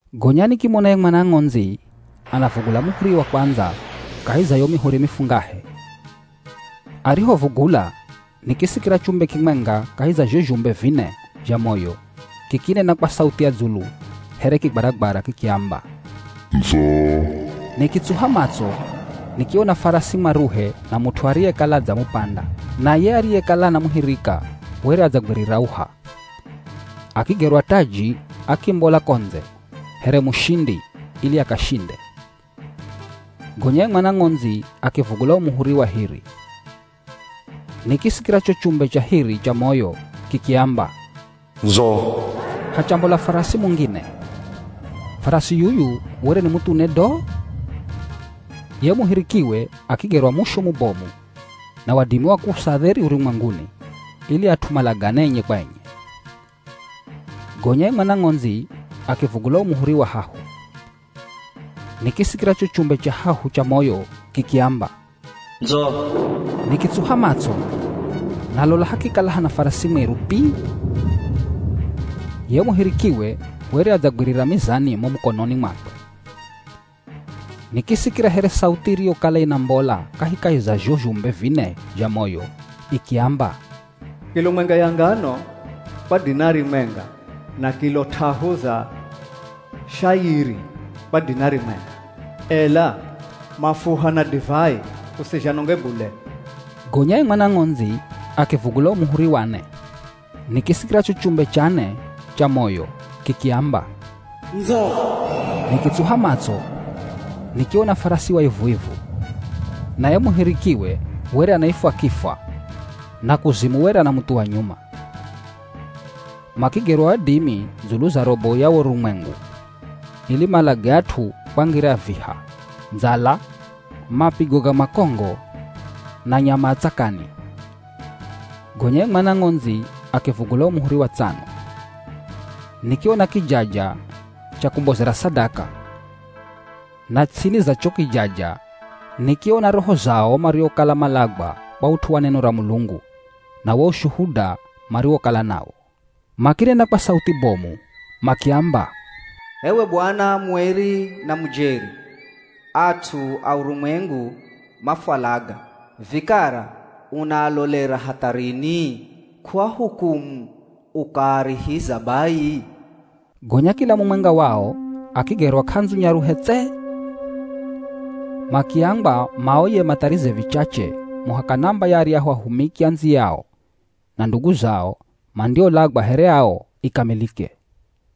Gonya nikimona ye Mwana Ng'ondzi anavugula muhuri wa kwandza kahi za yo mihuri mifungahe. Arihovugula, nikisikira chumbe kimwenga kahi za zho zhumbe vine zha moyo kikinena kwa sauthi ya dzulu here kigwaragwara kikiamba, “Ndzo!” Nikitsuha matso, nikiona farasi mwaruhe na mut'u ariyekala adzamupanda. Na ye ariyekala anamuhirika were adzagwirira uha. Akigerwa taji akimbola ko ndze here mushindi ili akashinde. Gonya ye Mwana Ng'ondzi akivugula wo muhuri wa hiri. Nikisikira cho chumbe cha hiri cha moyo kikiamba, “Ndzo!” Hachambola farasi mungine. Farasi yuyu were ni muthune do. Ye muhirikiwe akigerwa mushu mubomu na wadimi wa kuusa dheri urumwenguni ili at'u malagane enye kwa enye. Gonya ye Mwana Ng'ondzi akivugula wo muhuri wa hahu. Nikisikira cho chumbe cha hahu cha moyo kikiamba, “Ndzo!” Nikitsuha matso, na lola hakikala hana farasi mwiru pi. Ye muhirikiwe were adzagwirira mizani mo mukononi mwakwe. Nikisikira here sauthi iriyokala inambola kahikahi za zho zhumbe vine zha moyo ikiamba, “Kilo mwenga ya ngano kwa dinari mwenga na kilo t'ahu za shayiri kwa dinari mwenga. Ela mafuha na divai usizhanonge bule.” Gonya ye Mwana Ng'ondzi akivugula wo muhuri wa ne. Nikisikira cho chumbe cha ne cha moyo kikiamba, “Ndzo!” Nikitsuha matso, nikiona farasi wa ivu-ivu. Na ye muhirikiwe were anaifwa “Kifwa,” na “Kuzimu” were anamuthuwa nyuma. Makigerwa wadimi dzulu za robo ya wo urumwengu ili malage at'u kwa ngira ya viha, ndzala, mapigo ga makongo na nyama a tsakani. Gonya ye Mwana Ng'ondzi akivugula wo muhuri wa tsano. Nikiona kijaja cha kumbozera sadaka. Na ts'ini za cho kijaja, nikiona roho za o mariokala malagwa kwa ut'u wa neno ra Mulungu na wo ushuhuda mariwokala nawo. Makinena kwa sauthi bomu makiamba, “H'ewe Bwana mueri na mujeri, at'u a urumwengu mafwalaga, vikara unaalolera hatha rini? K'uahukumu ukaarihiza bai?” Gonya kila mumwenga wao akigerwa k'andzu nyaruhe tse. Makiambwa maoye matharize vichache muhaka namba ya aryahu ahumiki andziyao na ndugu zao mandiolagwa here ao ikamilike.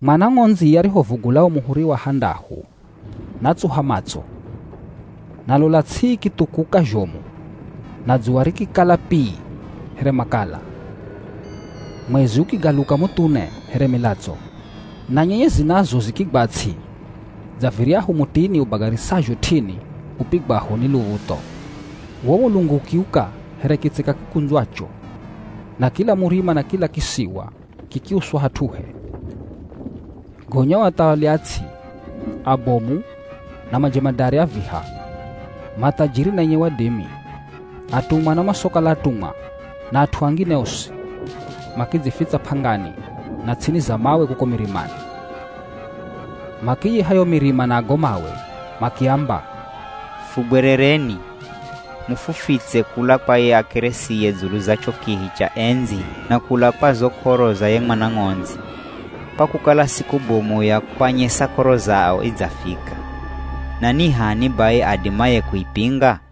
Mwana Ng'ondzi arihovugula wo muhuri wa handahu, natsuha matso. Na lola ts'i ikithukuka zhomu na dzuwa rikikala pi here makala. Mwezi ukigaluka muthune here milatso. Na nyenyezi nazo zikigwa ts'i dza viryahu mutini ubagarisazho t'ini upigwaho ni luv̱utho. Wo mulungu ukiuka here kitseka kikundzwacho, na kila murima na kila kisiwa kikiuswa hat'uhe. Gonya o athawali a ts'i, abomu, na majemadari a viha, mathajiri na enye wadimi, atumwa na masokala atumwa na at'u angine osi, makidzifitsa p'angani na ts'ini za mawe kuko mirimani. Makiyiha yo mirima na go mawe makiamba, “Fugwerereni, mufufitse kula kwa ye akelesiye dzulu za cho kihi cha endzi na kula kwa zo k'oro za ye Mwana Ng'ondzi, kwa kukala siku bomu ya kwanyesa k'oro zao idzafika, na ni h'ani bai adimaye kuipinga?”